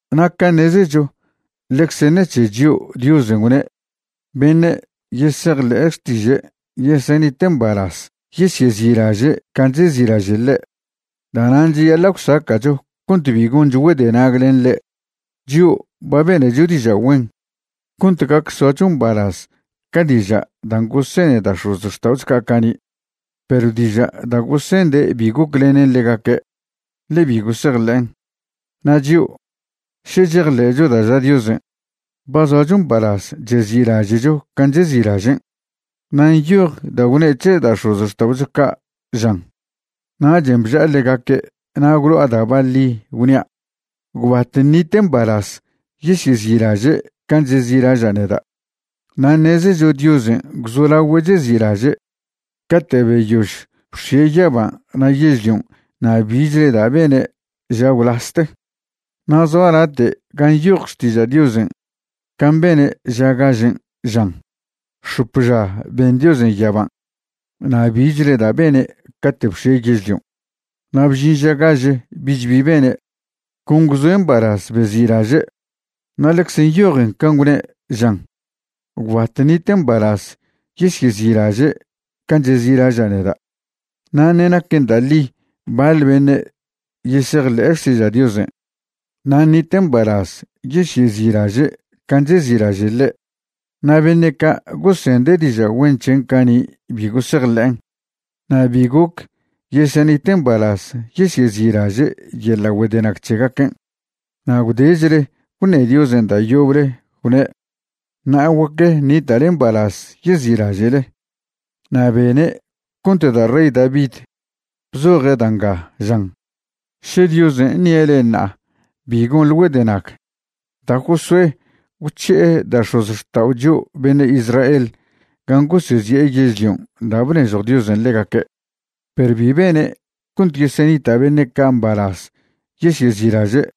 Na' ca' ṉezecho ḻecze ṉec̱he chio' Diosen' gwne' beṉe' yesejḻe' xtiže' yesenite' mbalaz yesyezi'laže' can' chezi'laže' ḻe'. Da'nan' cheyaḻa' gwsaca'cho cont bi goncho güedenag len ḻe'. Chio' ba benecho diža' güen cont gac soacho mbalaz ca diža' dan' gosene da' x̱ozxta'ocho ca' cani', perw diža' da' gosende' bi goclenen ḻegaque', ḻe bi gosejḻe'en. Na' chio', še chejḻe'cho da' ža Diosen', ba zoacho mbalaz chezi'laže'cho can' chezi'lažen'. Na' nyoj da' gwne' c̱he da' x̱ozxta'ocho ca', žan: Nachen' bža'a ḻegaque' na' gwlo'a da' baḻi, gwnia': “Gwbat ṉite' mbalaz yesyezi'laže' can' chezi'laža' neda'.” Na' ṉezecho Diosen' gwzolagüe' chezi'laže' cate' beyož bx̱ie' yaban' na' yežlion' na' bichle da' bene' ža gwlaste. Na' zoa late' gan' nyoj Xtiža' Diosen' can' bene' ža gažen', žan: X̱op ža ben Diosen' yaban', na' bichle da' bene' cate' bx̱ie' yežlion'. Na' bžin ža gaže, bich bi bene', con gwzoe' mbalaz bezi'laže'. Na' ḻecze nyojen can' gwne', žan: Gwbat ṉite' mbalaz yesyezi'laže' can' chezi'laža' neda'. Na' ṉe' naquen da' ḻi baḻ beṉe' yesejḻe'e xtiža' Diosen' na' ṉite' mbalaz yesyezi'laže' can' chezi'laže' ḻe', na' beṉe' ca gosende' diža' güen c̱hen' cani' bi gosejḻe'en, na' bi goc yesenite' mbalaz yesyezi'laže' yeḻa' güedenag c̱hegaquen'. Na' gwdechle gwṉe Diosen' da' yoble gwne': “Ṉa'a guac ṉita'le mbalaz yezi'laže'le.” Na' bene' cont da' rey David bzoje' da' nga, žan: Še Diosen' ṉie' le'e ṉa'a, bi gonḻe güedenag. Da' Josué gwc̱hi'e da' x̱ozxtao' chio' beṉe' Israel gan' gosezi'e yežlion' da' bnežjw Diosen' ḻegaque', perw bi bene' cont yesenita' beṉe' ca' mbalaz yesyezi'laže'.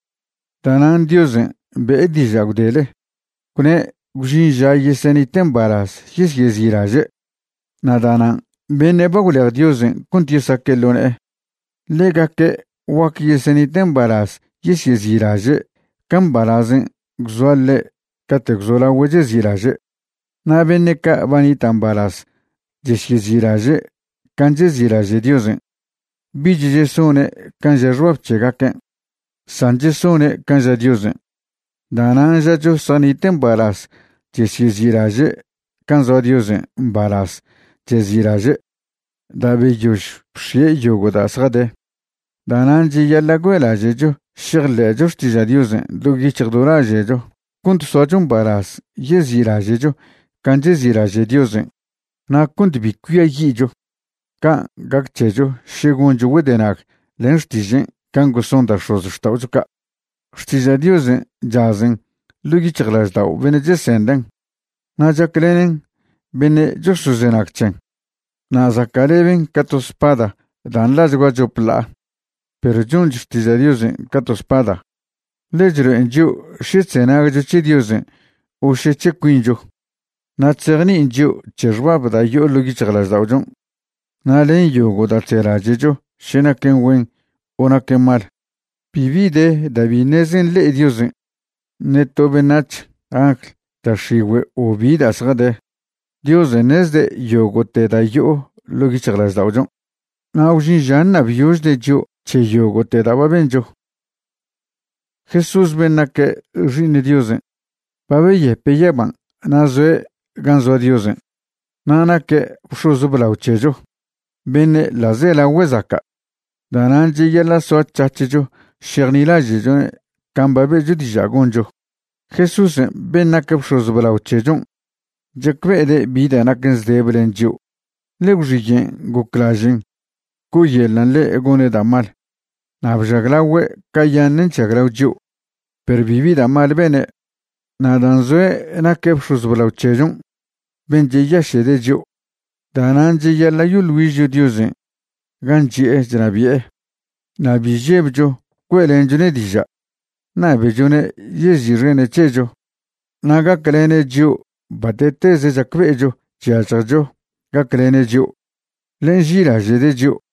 Da'nan' Diosen' be'e diža' gwdele, gwne' gwžin ža yesenite' mbalaz yesyezi'laže'. Na' da'nan' beṉe' ba gwlej Diosen' cont yesaque' ḻo ne'e, ḻegaque' guac yesenite' mbalaz yesyezi'laže' ca mbalazen' gwzoa ḻe' cate' gwzolagüe' chezi'laže'. Na' beṉe' ca' ba nita' mbalaz chesyezi'laže' can' chezi'laže' Diosen', bich chesone' can' ža xbab c̱hegaquen', san chesone' can' ža Diosen'. Da'nan' žacho zjanite' mbalaz chesyezi'laže' can' zoa Diosen' mbalaz chezi'laže' da' beyož bx̱ie' yogo' da' zjade. Da'nan' cheyaḻa' güe'laže'cho šejḻe'cho xtiža' Diosen' do yic̱hj do laže'cho cont soacho mbalaz yezi'laže'cho can' chezi'laže' Diosen' na' cont bi cuiayi'cho can' gac c̱hecho še goncho güedenag len xtižen' can' goson da' x̱ozxta'ocho ca'. Xtiža' Diosen' chazen ḻo' yic̱hjlaždao' beṉe' chesenden' na' chaclenen beṉe' chosozenag c̱hen. Na' zaca'leben ca to spada da' nḻachgua chop ḻa'a. Perw chonch Xtiža' Diosen' ca to spada, ḻe chlo'en chio' še chzenagcho c̱he Diosen' o še c̱he cuincho, na' chzejni'in chio' c̱he xbab da' yo'o ḻo' yic̱hjlažda'ochon' na' len yogo' da' chzelaže'cho še naquen güen o naquen mal. Bibi de da' bi ṉeze nḻe'e Diosen', ṉe to beṉac̱h, angl, da' x̱igüe' o bi da' zjade. Diosen' ṉezde' yogo'te da' yo'o ḻo' yic̱hjlažda'ochon'. Na' gwžin ža ṉabyožde' chio' c̱he yogo'te da' ba bencho. Jesús ben' naque' Xi'iṉ Diosen' ba beyepe' yaban' na' zoe' gan' zoa Diosen'. Na' naque' bx̱oz blao c̱hecho beṉe' ḻa'zelagüe zaca'. Da'nan' cheyaḻa' soac̱hac̱hcho šejnilaže'chone' can' ba be'cho diža' goncho. Jesúsen' ben' nac bx̱oz blao c̱hechon' chacbe'ede' bi da' naquen zdebe len chio', ḻe gwxiyen' goclažen' co'oyeḻan' ḻe' gone' da' mal, na' bžaglagüe' cayaṉen' chžaglao chio', perw bibi da' mal bene'. Na' dan' zoe' naque' bx̱oz blao c̱hechon' ben' cheyaše'de' chio', da'nan' cheyaḻa' yoḻ güižcho Diosen' gan' chi'e chnabi'e, na' bi žebcho güe'lenchone' diža', ṉabechone' yezi'xene' c̱hecho na' gaclene' chio' bate'teze chacbe'echo chyažjecho gaclene' chio', ḻe nži'ilaže'de' chio'.